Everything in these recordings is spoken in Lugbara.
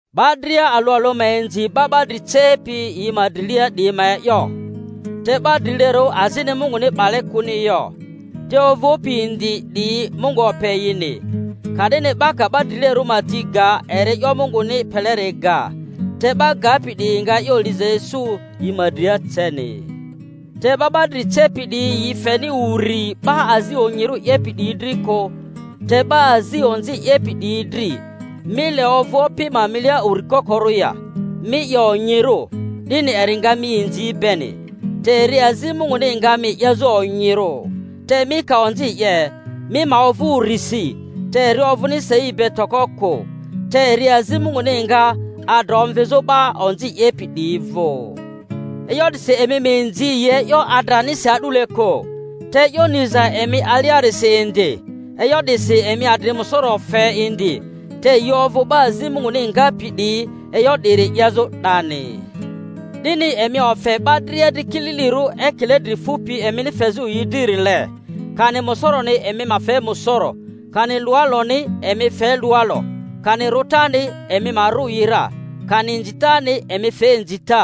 'Ba dria alᴜ alᴜ ma inzi 'ba 'ba dri cepi yi ma drilia 'diyi ma e'yo. Te 'ba drilerᴜ azini Munguni 'bale kᴜni yo, te ovᴜpi indi 'diyi Mungu ope yini. Ka'dini 'ba ka 'ba drilerᴜ ma ti ga eri e'yo Munguni peleri ga, te 'ba gapi 'diyi nga e'yo liza isu yi ma dria ceni. Te 'ba 'ba dri cepi 'diyi yi feni uri 'ba azi onyirᴜ 'yepi 'diyi dri kᴜ, te 'ba azi onzi 'yepi 'diyi dri. Mi le ovᴜ opi ma milia uri kokoru ya? Mi 'ye onyirᴜ, 'dini eri nga mi inzi beni, te eri azi Munguni nga mi 'yezᴜ onyirᴜ. Te mi ka onzi 'ye, mi ma ovᴜ urisi, te eri ovᴜni sei be toko kᴜ; te eri azi Munguni nga, adra omvizᴜ 'ba onzi 'yepi 'diyi vᴜ. E'yo 'disi emi ma inzi yi e'yo adranisi a'dule kᴜ, te e'yo niza emi aliarisi indi. E'yo 'disi emi adri musoro fe indi, te yi ovᴜ 'ba azi Munguni ngapi 'diyi e'yo 'diri 'yezᴜ 'dani. 'Dini emi ofe 'ba dria dri kililirᴜ ekile dri fupi emini fezᴜ yi dririle, kani musoroni emi ma fe musoro, kani luwaloni, emi fe luwalo, kani rᴜtani emi ma rᴜ yi ra, kani inzitani emi fe inzita.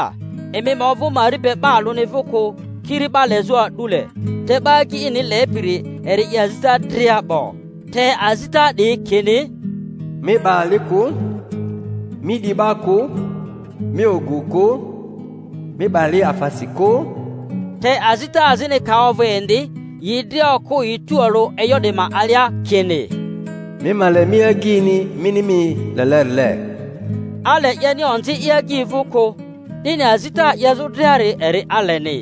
Emi ma ovᴜ mari be 'ba alᴜni vᴜ kᴜ, kiri 'ba lezᴜ a'dule; te 'ba agyi ini lepiri eri 'ye azita dria 'bo. Te azita 'diyi kini, Mi 'ba ali kᴜ, Mi 'di 'ba kᴜ, Mi ogu kᴜ, Mi 'ba li afasi kᴜ, te azita azini ka ovᴜ indi, yi dria okᴜ yi tualᴜ e'yo 'di ma alia, kini, Mi ma le mi agyini mini mi lelerile. Ale 'yeni onzi i agyi vᴜ kᴜ; 'dini azita 'yezᴜ driari eri aleni.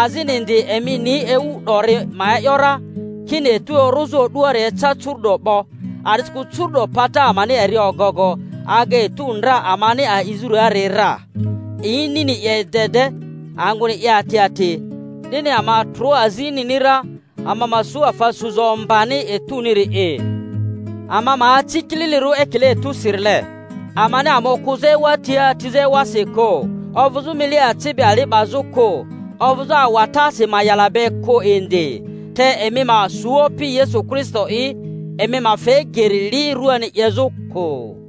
Azini indi emi ni ewu 'dori ma e’yo ra, kini etu orᴜzᴜ o'duari eca curu'do 'bo. A'disikᴜ curu'do pata amani eri ogogo aga etu ndra amani a'izᴜriari ra; inini 'ye i de de, angᴜni 'ye ati ati. 'Dini ama ma trᴜ azi inini ra, ama ma su afa suza om-bani etuniri'i; ama ma aci kililirᴜ ekile etusirile, amani ama okᴜzᴜ ewa tia atizᴜ ewasi kᴜ, ovᴜzᴜ mile aci be ali 'bazᴜ kᴜ, ovᴜzᴜ awatasi ma'yala be kᴜ indi. Te emi ma su Opi Yesu Kristo'i, emi ma fe geri li ruani 'yezᴜ kᴜ.